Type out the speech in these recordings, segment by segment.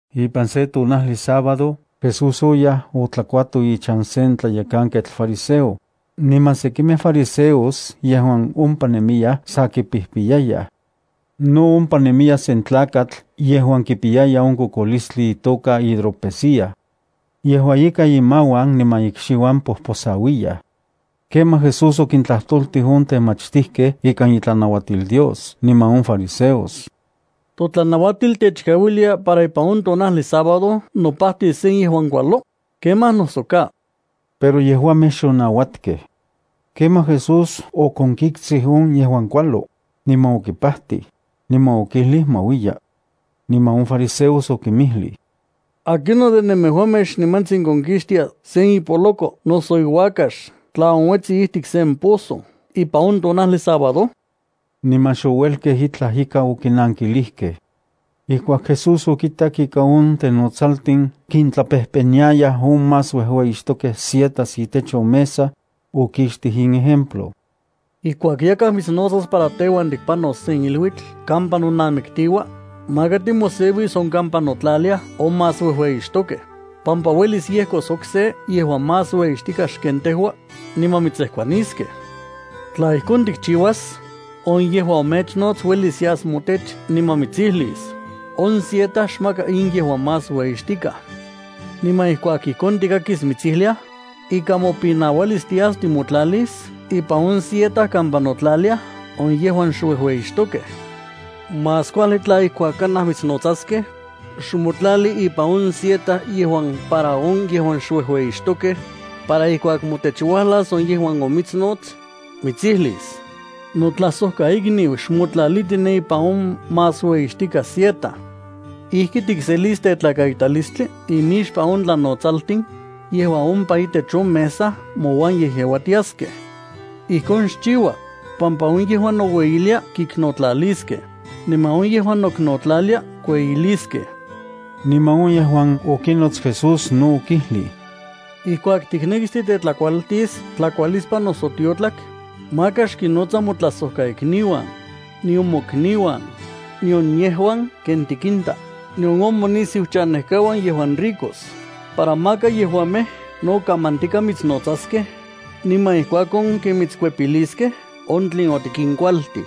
Ipan sen tonajli sábado, Jesús oyaj otlakuato ichan sen tlayekanketl fariseo, niman sekimej fariseos yejuan ompa nejnemiyaj sa kipijpiyayaj. No ompa nemiya sen tlakatl yejuan kipiyaya on kokolistli itoka hidropesía. Yejua ika imauan niman ikxiuan pojposauiyaj. Kemaj Jesús okintlajtoltij on temachtijkej ikan itlanauatil Dios niman on fariseos: —¿Totlanauatil techkauilia para ipan on tonajli sábado nopajtis se yejuan kualo? ¿Kemaj noso ka? Pero yejuamej xonauatkej. Kemaj Jesús okonkiktsij on yejuan kualo, niman okipajtij, niman okijlij ma uiya. Niman on fariseos okinmijlij: —¿Akinon de nemejuamej xnimantsin konkixtia sen ipoloko noso iuakax tla onuetsi ijtik sen pozo ipan on tonajli sábado? Niman xouelkej itlaj ika okinankilijkej. Ijkuak Jesús okitak ika on tenotsaltin kintlapejpeniayaj on más uejueyixtokej sietas itech on mesa, okixtij in ejemplo: —Ijkuak yakaj mitsnotsas para teuan tikpanos sen iluitl kampa nonamiktiua, maka timoseuis on kampa notlaliaj on más uejueyixtokej, pampa uelis yejkos okse yejuan más uejueyixtikaj xken tejua, niman mitsejkuaniskej. Tla ijkon tikchiuas, on yejuan omechnots uelis yas motech niman mitsijlis: “On sieta xmaka in yejuan más ueyixtikaj.” Niman ijkuak ijkon tikakis mitsijliaj, ikan mopinauilis tias timotlalis ipan on sieta kampa notlaliaj on yejuan xuejueyixtokej. Más kuajli tla ijkuak kanaj mitsnotsaskej, xmotlali ipan on sieta yejuan para on yejuan xuejueyixtokej, para ijkuak motech uajlas on yejuan omitsnots, mitsijlis: “Notlajsojkaikniu, xmotlaliti ne ipan on más ueyixtikaj sieta.” Ijki tikselis tetlakaitalistli imixpan on tlanotsaltin yejuan ompa itech on mesa mouan yejyeuatiaskej. Ijkon xchiua, pampa on yejuan noueyilia, kiknotlaliskej, niman on yejuan noknotlalilia kueyiliskej. Niman on yejuan okinots Jesús no okijlij: —Ijkuak tiknekis titetlakualtis tlakualispan noso tiotlak, maka xkinnotsa motlajsojkaikniuan, nion mokniuan, nion yejuan ken tikinta, nion on monisiuchanejkauan yejuan ricos, para maka yejuamej no kamantika mitsnotsaskej niman ijkuakon ken mitskuepiliskej on tlen otikinkualtij.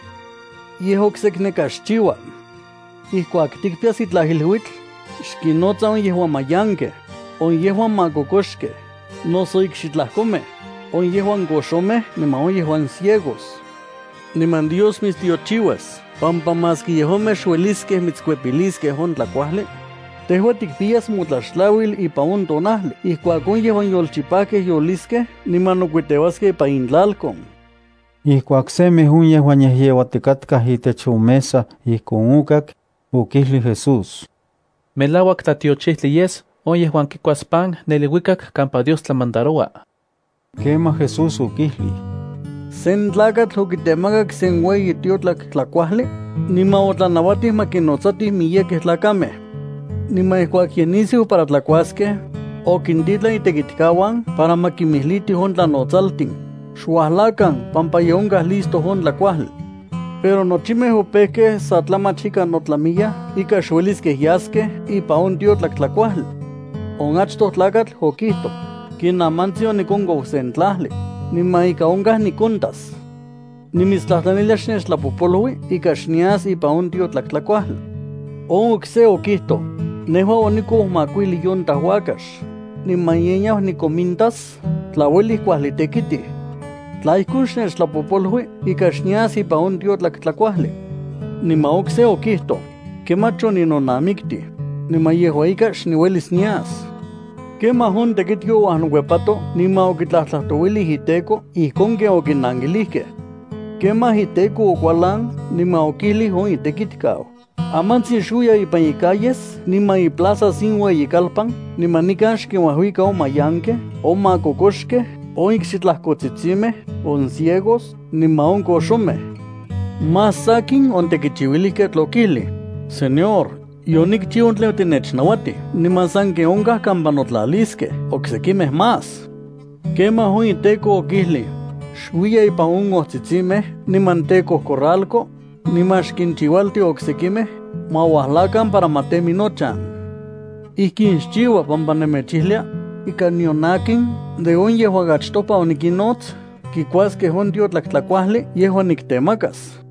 Yej oksekneka xchiua. Ijkuak tikpiyas itlaj iluitl, xkinnotsa on yejuan mayankej, on yejuan makokoxkej noso ikxitlajkomej, on yejuan koxomej niman on yejuan ciegos. Niman Dios mitstiochiuas pampa maski yejuamej xueliskej mitskuepiliskej on tlakuajli, tejua tikpiyas motlaxtlauil ipan on tonajli ijkuak on yejuan yolchipajkej yoliskej niman nokuiteuaskej ipan intlalkon. Ijkuak semej on yejuan yejyeuatikatkaj itech on mesa ijkon okak, okijlij Jesús: —Melauak tlatiochijtli yes on yejuan kikuas pan ne iluikak kampa Dios tlamandaroua. Kemaj Jesús okijlij: —Sen tlakatl okitemakak sen ueyi tiotlak tlajkuajli, niman otlanauatij ma kinnojnotsatij miyekej tlakamej. Niman ijkuak ye nisiu para tlakuaskej, okintitlan itekitkauan para ma kinmijlitij on tlanotsaltin: “Xuajlakan pampa ye onkaj listo on tlakuajli.” Pero nochimej opejkej sa tlamach ika notlamiyaj ika xueliskej yaskej ipan on tiotlak tlajkuajli. On achtoj tlakatl okijtoj: “Kinamantsin onikonkou sen tlajli, niman ika onkaj nikontas. Nimitstlajtlanilia xnechtlapojpolui ika xnias ipan on tiotlak tlajkuajli.” On okse okijtoj: “Nejua onikou makuijli yunta uakax, niman ye niau nikonmintas tla uelij kuajli tekitij. Tla ijkon, xnechtlapojpolui ika xnias ipan on tiotlak tlajkuajli.” Niman okse okijtoj: “Kemach oninonamiktij, niman yejua ika xniuelis nias.” Kemaj on tekitki ouajnokuepato niman okitlajtlajtouilij iteko ijkon ken okinankilijkej. Kemaj, iteko okualan niman okijlij on itekitkau: “Amantsin xuiya ipan icalles niman iplazas in ueyikalpan, niman nikan xkinuajuika on mayankej, on makokoxkej, on ikxitlajkotsitsimej, on ciegos, niman on koxomej.” Más sakin, on tekichiuilijketl okijlij: “Señor, yonikchiu tlen otinechnauatij niman sanken onkaj kampa notlaliskej oksekimej más.” Kemaj on iteko okijlij: “Xuiya ipan on ojtsitsimej niman tekojcorralco, niman xkinchiualti oksekimej ma uajlakan para ma temi nochan. Ijkin xchiua, pampa nemechijlia ika nion akin de on yejuan achtopa onikinnots kikuaskej on tiotlak tlajkuajli yejuan niktemakas.”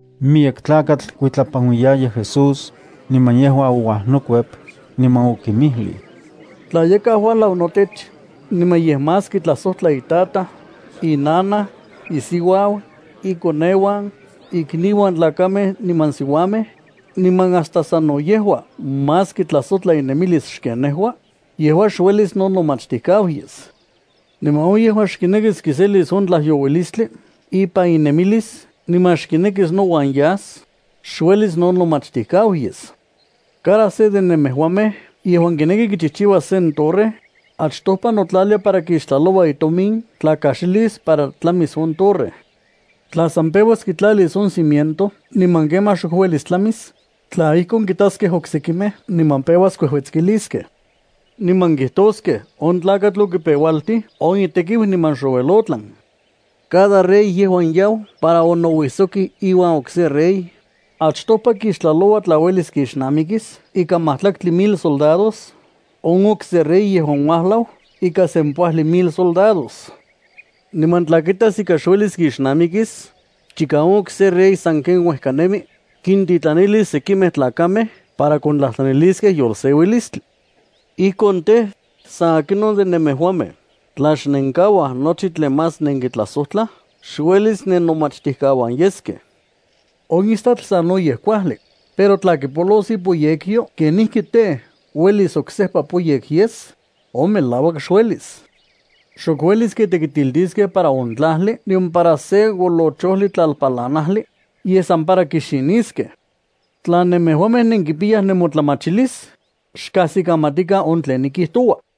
Miyek tlakatl kuitlapanuijtiayaj Jesús, niman yejua ouajnokuep, niman okinmijlij: —Tla yakaj uajlau notech, niman yej más kitlajsojtla itataj, inanaj, isiuau, ikoneuan, ikniuan tlakamej niman siuamej, niman hasta sano yejua más kitlajsojtla inemilis xken nejua, yejua xuelis nonomachtijkau yes. Niman on yejuan xkinekis kiselis on tlajyouilistli ipan inemilis niman xkinekis nouan yas, xuelis nonomachtijkau yes. Cada se de nemejuamej yejuan kineki kichijchiuas sen torre, achtopa notlalia para kixtlaloua itomin tla kaxilis para tlamis on torre. Tla san peuas kitlalis on cimiento niman kemaj xok uelis tlamis, tla ijkon, kitaskej oksekimej niman peuas kuejuetskiliskej. Niman kijtoskej: “On tlakatl okipeualtij on itekiu niman xouel otlan.” Cada rey yejuan yau para onouisoki iuan okse rey, achtopa kixtlaloua tla uelis kixnamikis ikan majtlaktli mil isoldados on okse rey yejuan uajlau ikan sempoajli mil isoldados. Niman tla kitas ika xuelis kixnamikis, chika on okse rey sanken uejka nemi, kintitlanilis sekimej tlakamej para kontlajtlaniliskej yolseuilistli. Ijkon tej, san akinon de nemejuamej tla xnenkauaj nochi tlen más nenkitlajsojtla, xuelis nennomachtijkauan yeskej. ’On istatl sanoyej kuajli, pero tla kipolos ipoyekyo, ¿kenijki tej, uelis oksejpa poyek yes? On melauak xuelis. Xok uelis kitekitiltiskej para on tlajli nion para se olochojli tlalpalanajli, yej san para kixiniskej. Tla nemejuamej nenkipiyaj nemotlamachilis, xkajsikamatikan on tlen nikijtoua.